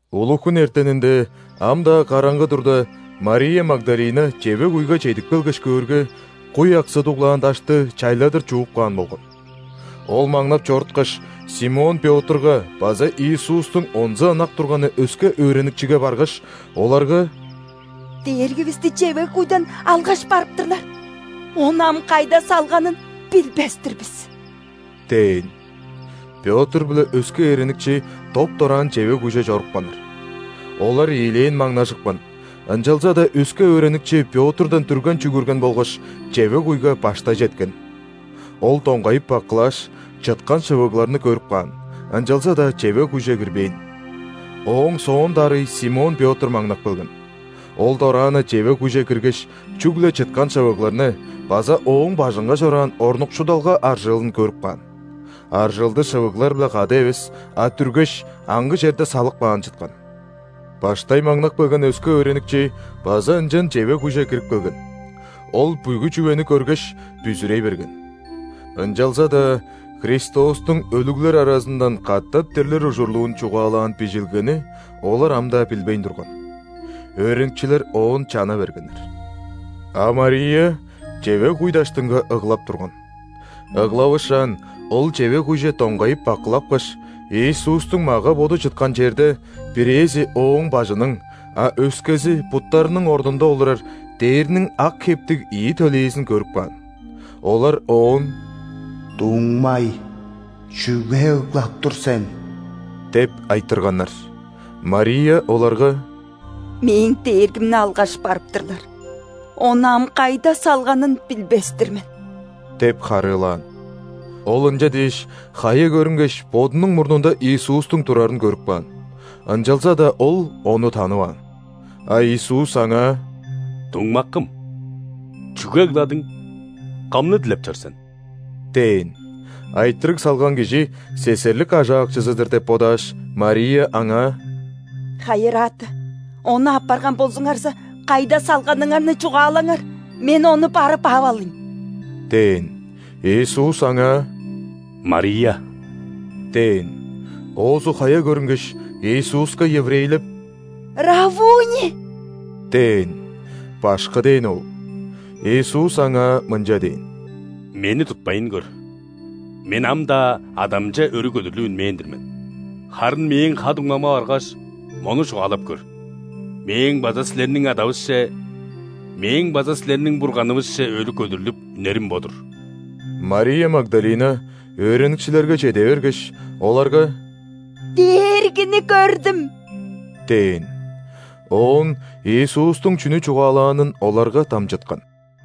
Улуг-хүн эртенинде, ам-даа караңгы турда, Мария Магдалина чевег-куйга чедип келгеш, көөрге, куй аксы дуглаан дашты чайладыр чууп каан болган. Ол маңнап чоруткаш, Симон Пётрга база Иисустуң онза ынак турганы өске өөреникчиге баргаш, оларга: «Дээргивисти чевег-куйдан алгаш барып-тырлар! Ону ам кайда салганын билбес-тир бис» – дээн. Пётр биле өске өөреникчи доп-дораан чевег-куйже чорупканнар. Олар ийилээн маңнажыпкан, ынчалза-даа өске өөреникчи Пётрдан дүрген чүгүрген болгаш, чевег-куйга баштай четкен. Ол доңгайып бакылааш, чыткан шывыгларны көрүп каан, ынчалза-даа чевег-куйже кирбээн. Ооң соон дарый Симон Пётр маңнап келген. Ол дораан-на чевег-куйже киргеш, чүгле чыткан шывыгларны база Ооң бажынга чораан орнукшудулга аржыылын көрүп каан. Аржыылды шывыглар-биле кады эвес, а дүргеш, аңгы черде салып каан чыткан. Баштай маңнап келген өске өөреникчи база ынчан чевег-куйже кирип келген. Ол бүгү чүвени көргеш, бүзүрей берген. (Ынчалза-даа Христостуң өлүглер аразындан катап дирлир ужурлуун чугаалаан Бижилгени олар ам-даа билбейн турган.) Өөреникчилер оон чана бергеннер. А Мария чевег-куй даштынга ыглап турган. Ыглавышаан, ол чевег-куйже доңгайып бакылапкаш, Иисустуң мага-боду чыткан черде – бирээзи Ооң бажының, а өскези буттарының орнунда олурар – дээрниң ак хептиг ийи төлээзин көрүп каан. Олар оон: «Дуңмай, чүге ыглап тур сен?» – деп айтырганнар. Мария оларга: «Мээң Дээргимни алгаш барып-тырлар. Ону ам кайда салганын билбес-тир мен» – деп харыылаан. Ол ынча дээш, хая көрүнгеш, бодунуң мурнунда Иисустуң турарын көрүп каан. Ынчалза-даа ол Ону танываан. А Иисус аңаа: «Дуңмакым! Чүге ыгладың? Кымны дилеп чор сен?» – дээн. Айтырыг салган кижи сесерлик ажаакчызы-дыр деп бодааш, Мария Аңаа: «Хайырааты! Ону аппарган болзуңарза, кайда салганыңарны чугаалаңар, мен Ону барып ап алыйн» – дээн. Иисус аңаа: «Мария!» – дээн. Оозу хая көрүнгеш, Иисуска еврейлеп: «Раввуни!» – дээн. («Башкы» дээни ол.) Иисус аңаа мынча дээн: «Мени тутпайн көр! Мен ам-даа Адамче өрү көдүрлүп үнмээн-дир мен. Харын Мээң ха-дуңмамга баргаш, мону чугаалап көр: „Мээң база силерниң Адавысче, Мээң база силерниң Бурганывысче өрү көдүрлүп үнерим бо-дур“». Мария Магдалина өөреникчилерге чеде бергеш, оларга: «Дээргини көрдүм!» – дээн. Оон Иисустуң чүнү чугаалаанын оларга дамчыткан.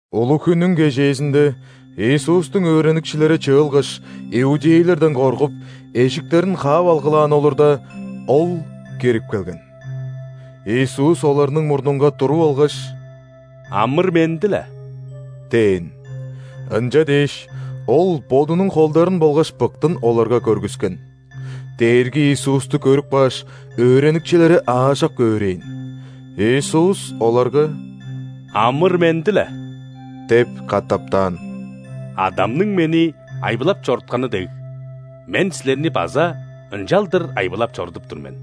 Улуг-хүннүң кежээзинде Иисустуң өөреникчилери чыылгаш, иудейлерден коргуп, эжиктерин хаап алгылаан олурда, Ол кирип келген. Иисус оларның мурнунга туруп алгаш: «Амыр-менди-ле» – дээн. Ынча дээш, Ол Бодунуң холдарын болгаш быктын оларга көргүскен. Дээрги Иисусту көрүп кааш, өөреникчилери аажок өөрээн. Иисус оларга: «Амыр-менди-ле – деп катаптаан. – Адамның Мени айбылап чорутканы дег, Мен силерни база ынчалдыр айбылап чорудуп тур мен».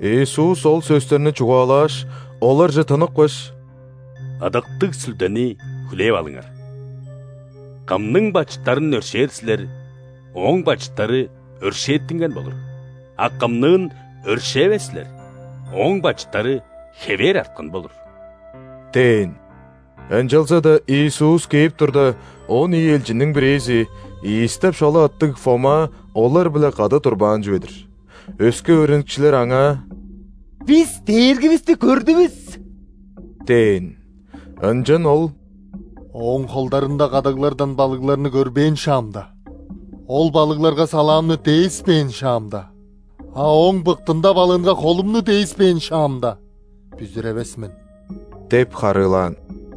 Иисус ол сөстерни чугаалааш, оларже тыныпкаш: «Ыдыктыг Сүлдени хүлээп алыңар! Кымның бачыттарын өршээр силер, ооң бачыттары өршээттинген болур, а кымныын өршээвес силер, ооң бачыттары хевээр арткан болур» – дээн. Ынчалза-даа, Иисус кээп турда, он ийи элчинниң бирээзи, Ийис деп шола аттыг Фома олар-биле кады турбаан чүве-дир. Өске өөреникчилер аңаа: «Бис Дээргивисти көрдүвүс!» – дээн. Ынчан ол: «Ооң холдарында кадаглардан балыгларны көрбээн шаамда, ол балыгларга салаамны дээспээн шаамда, а Ооң быктында балыынга холумну дээспээн шаамда, бүзүревес мен!» – деп харыылаан.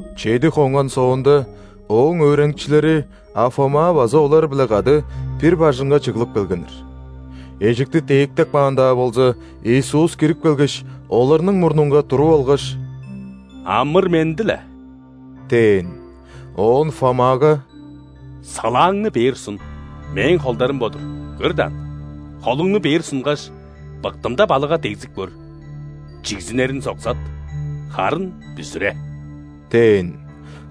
Чеди хонган соонда, Ооң өөреникчилери, а Фома база олар-биле кады, бир бажыңга чыглып келгеннер. Эжикти дээктеп каан-даа болза, Иисус кирип келгеш, оларның мурнунга туруп алгаш: «Амыр-менди-ле!» – дээн. Оон Фомага: «Салааңны бээр сун. Мээң холдарым бо-дур, көр даан. Холуңну бээр сунгаш, быктымда балыгга дегзип көр. Чигзинериң соксат! Харын бүзүре» – дээн.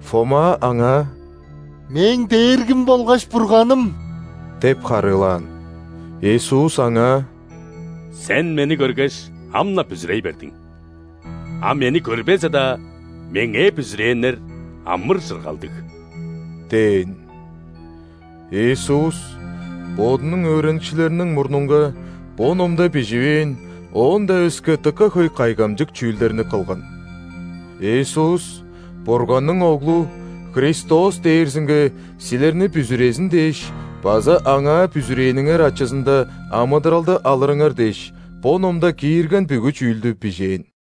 Фома Аңаа: «Мээң Дээргим болгаш Бурганым!» – деп харыылаан. Иисус аңаа: «Сен Мени көргеш, ам-на бүзүрей бердиң. А Мени көрбезе-даа, Меңээ бүзүрээннер – амыр-чыргалдыг» – дээн. Иисус Бодунуң өөреникчилериниң мурнунга бо номда биживээн оон-даа өске дыка хөй кайгамчык чүүлдерни кылган. Иисус – Бурганның Оглу, Христос дээрзинге силерни бүзүрезин дээш база Аңаа бүзүрээниңер ачызында амыдыралды алырыңар дээш, бо номда киирген бүгү чүүлдү бижээн.